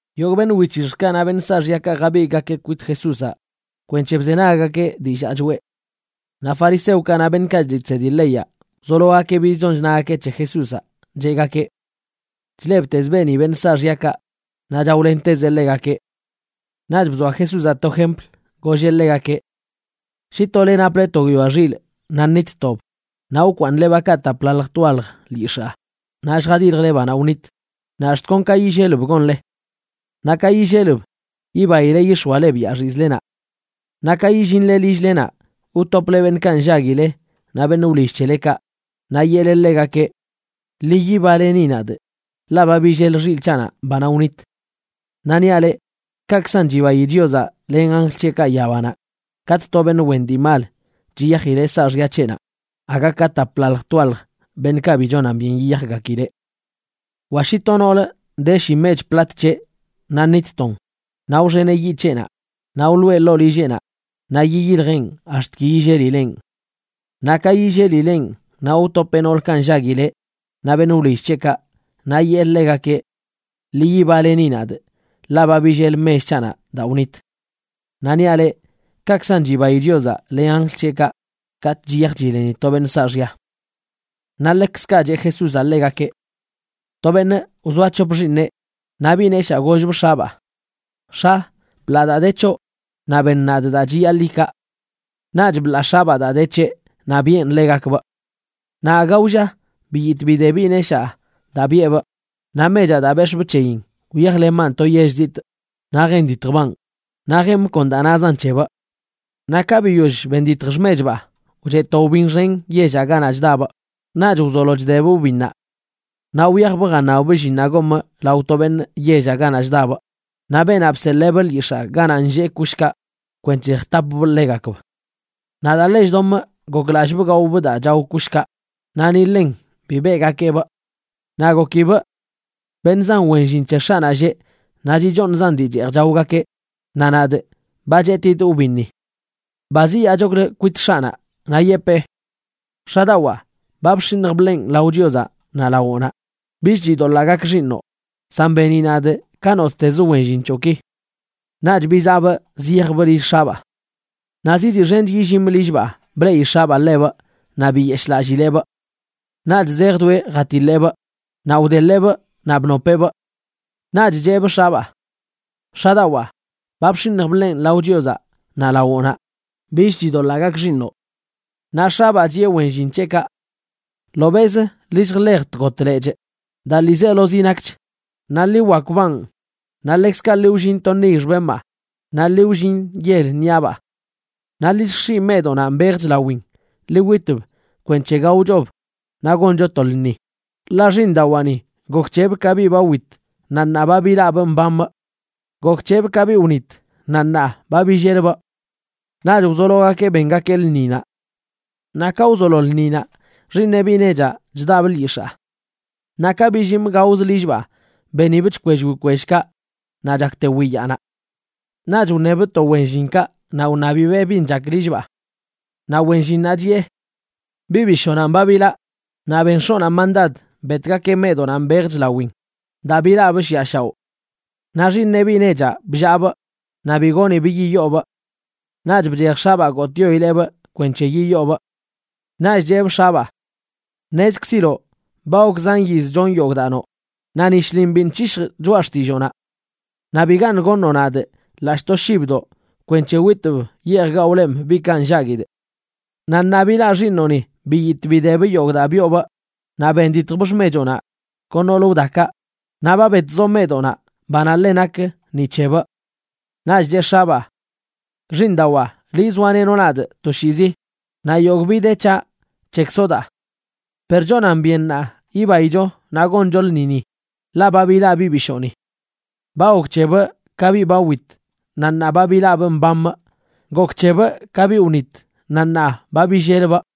Yogꞌ beṉꞌ wic̱hixjkaꞌ naꞌ beṉꞌ saaxyakaꞌ jabigꞌgakeꞌ kwit Jesúzaꞌ kwenc̱he bzenaggakeꞌ dillaa choꞌe. Naꞌ fariseokaꞌ naꞌ beṉꞌkaꞌ chliꞌ chsedi leyaꞌ wzologakeꞌ biz chon chnagakeꞌ c̱he Jesúzaꞌ, cheꞌgakeꞌ: ―Chlebtezə beeni beṉꞌ saaxyakaꞌ naꞌ chaolentezeꞌ ḻegakeꞌ. Naꞌch bzoa Jesúzaꞌ to jempl, golleꞌ ḻegakeꞌ: ―Shi tole naple to guiyoa xilꞌ naꞌ ṉit tob, naꞌ wkwaaṉle bakaꞌ taplalj twaḻj lyix̱aa naꞌ lljadiljle banaꞌ wnit, naꞌ ax̱t kon ka yillelb gonle. Naꞌ ka yillelb, yibaile yix̱oaleb yaaxizlenaꞌ. Naꞌ ka yillinle lill-lenaꞌ wtople beṉꞌkaꞌ nllaguile naꞌ beṉꞌ wlill c̱helekaꞌ, naꞌ yeꞌle ḻegakeꞌ: “Ḻi yibaleni nadꞌ, ḻaꞌ ba billel xilꞌ c̱haꞌnaꞌ banaꞌ wnit.” Naꞌ niaꞌ leꞌ, kaꞌkzan chibayi Chiozaꞌ len anjl c̱heꞌkaꞌ yabanaꞌ katꞌ to beṉꞌ wen dii mal chiyajileꞌ saaxya c̱heꞌnaꞌ aga ka taplalj twaḻj beṉꞌkaꞌ bi chonan byen yiyajgakileꞌ. ’Wa shi to noolə de shi mech plat c̱heꞌ naꞌ ṉit ton, naꞌ wxeneꞌ yiꞌ c̱heꞌnaꞌ naꞌ wḻoeꞌ ḻoo lilleꞌnaꞌ naꞌ yiyiljeꞌn ax̱t ki yillelileꞌn. Naꞌ ka yillelileꞌn naꞌ wtopeꞌ noolkaꞌ nllaguileꞌ naꞌ beṉꞌ wlill c̱heꞌkaꞌ, naꞌ yee ḻegakeꞌ: “Ḻi yibaleni nadꞌ, ḻaꞌ ba billel mech c̱haꞌnaꞌ daa wnit.” Naꞌ niaꞌ leꞌ, kaꞌkzan chibayi Chiozaꞌ len anjl c̱heꞌkaꞌ katꞌ chiyaj chileni to beṉꞌ saaxya. Naꞌ ḻekzkaꞌ cheꞌ Jesúzaꞌ ḻegakeꞌ: ―To beṉꞌ wzoa c̱hop xiiṉeꞌ, naꞌ biꞌ neshaa gollbꞌ x̱abaa: “X̱a, bḻaa daa de c̱hoꞌ naꞌ beṉ nadꞌ daa chiyaḻꞌ ikaa.” Naꞌch bḻaa x̱abaa daa de c̱heꞌ naꞌ biꞌen ḻegakbꞌ. Naꞌ aga wlla, biyitꞌ bide biꞌ neshaa daa biꞌebꞌ, naꞌ mechaꞌ daa bex̱ꞌbꞌ c̱heyin wyajlemaꞌn to yell zitꞌ naꞌ jenditjbaꞌn naꞌ jemꞌ kon daa nazan c̱hebꞌ. Naꞌ ka biyoll benditj xmechbaa wcheꞌ to wbiṉ xen yellaꞌ ganaꞌ chdabꞌ, naꞌch wzolo chdebꞌ wbinnaꞌ. Naꞌ wyajbꞌ jaṉabbꞌ llinnaꞌ gomꞌ lao to beṉꞌ yellaꞌ ganaꞌ chdabꞌ, naꞌ beenaꞌ bseḻeebꞌ lyix̱aa ganaꞌ nllee kushkaꞌ kwenc̱he jtapbꞌ ḻegakb. Naꞌ daa ḻe chdomꞌ goklallꞌbꞌ gaobꞌ daa chao kushkaꞌ, naꞌ ni ḻen bi beꞌgakeꞌbꞌ. Naꞌ gokibꞌ: “Beṉꞌ zan wen llin c̱he x̱aꞌnaꞌ lleꞌ naꞌ chichooṉzan dii cheej chaogakeꞌ, naꞌ nadꞌ, ba chetidꞌ wbinni. Ba ziyaachoklə kwit x̱aꞌnaꞌ naꞌ yepee: X̱adawaa, ba bx̱iṉjꞌ bḻenꞌ lao Chiozaꞌ naꞌ lawoꞌnaꞌ. Bich chidoḻaa gakꞌ xiiṉoꞌ, san beni nadꞌ ka nottezə wen llin c̱hoꞌki.” Naꞌch bizaꞌbꞌ ziyajbꞌ lill x̱abaa. ’Naꞌ zi dii xench yillimꞌ lillbaa bleꞌi x̱abaa ḻebꞌ naꞌ biyeshꞌlallileꞌbꞌ. Naꞌch zejdoeꞌ jatiḻeꞌbꞌ naꞌ wdeḻeꞌbꞌ naꞌ bnopeꞌbꞌ. Naꞌch cheꞌbꞌ x̱abaa: “X̱adawaa, ba bx̱iṉj bḻenꞌ lao Chiozaꞌ naꞌ lawoꞌnaꞌ, bich chidoḻaa gakꞌ xiiṉoꞌ.” Naꞌ x̱abaa chiꞌe wen llin c̱heꞌkaꞌ: “Ḻobeꞌzə ḻi lljḻej tgot lechꞌ daa ḻiizelozi nakch naꞌ ḻi wwakwbaꞌn, naꞌ ḻekzkaꞌ ḻi wllin to niy xbemaa naꞌ ḻi wllin yel ṉiꞌabaa. Naꞌ ḻi lljx̱iꞌ meꞌdoꞌnaꞌ mbejchlawin, ḻi witb kwenc̱he gaochob naꞌ goncho to lṉi, ḻaꞌ xiiṉdawaani gok c̱hebꞌ ka biꞌ ba wit, naꞌ ṉaa ba bilaꞌbꞌ mbamꞌ. Gok c̱hebꞌ ka biꞌ wnit, naꞌ ṉaa ba billelbꞌ.” Naꞌch wzologakeꞌ bengakeꞌ lṉinaꞌ. ’Naꞌ ka wzolo lṉinaꞌ, xiiṉeꞌ biꞌ nechaꞌ chdabꞌ lyix̱aa. Naꞌ ka billimꞌ gaozə lillbaa, benibꞌ chkwell wikwellkaꞌ naꞌ chakte wiyaanaꞌ. Naꞌch wṉebꞌ to wen llinkaꞌ naꞌ wṉabibee bin chak lillbaa. Naꞌ wen llinnaꞌ chiꞌe: “Biꞌ bishoonanꞌ ba bilaꞌ, naꞌ ben x̱oꞌnaꞌ mandad betgakeꞌ meꞌdoꞌnaꞌ mbejchlawin daa bilaꞌbꞌ shiꞌa shaoꞌ.” Naꞌ xiiṉeꞌ biꞌ nechaꞌ bllaabꞌ naꞌ bi goonibꞌ yiyoobꞌ. Naꞌch bchej x̱abaa gotꞌyoileꞌbꞌ kwenc̱he yiyoobꞌ. Naꞌch cheꞌbꞌ x̱abaa: “Ṉezkziloꞌ ba gok zan yiz chonꞌ yogꞌ daa noꞌ, naꞌ ni shlin biṉꞌ c̱hishjꞌ choꞌa xtilloonaꞌ. Naꞌ bigaṉꞌ goṉoꞌ nadꞌ ḻaꞌc̱hꞌ to shibdoꞌ kwenc̱he witꞌb yeej gaolemꞌ biꞌkaꞌ nllaguidꞌ. Naꞌ ṉaa bilaꞌ xiiṉoꞌni biyitꞌ bidebꞌ yogꞌ daa biꞌobꞌ naꞌ benditjbꞌ xmechoꞌnaꞌ kon noolə wdakaꞌ, naꞌ ba betzoꞌ meꞌdoꞌnaꞌ, banaꞌ ḻe nak, ni c̱hebꞌ.” Naꞌch cheꞌ x̱abaa: “Xiiṉdawaa, liꞌ zoalenoꞌ nadꞌ toshiizi, naꞌ yogꞌ bi de c̱haꞌ c̱hekzoꞌ daa. Per chonan byen ṉaa yibaicho naꞌ goncho lṉini, ḻaꞌ ba bilaꞌ biꞌ bishooni. Ba gok c̱hebꞌ ka biꞌ ba wit, naꞌ ṉaa ba bilaꞌbꞌ mbamꞌ; gok c̱hebꞌ ka biꞌ wnit, naꞌ ṉaa ba billelbꞌ.”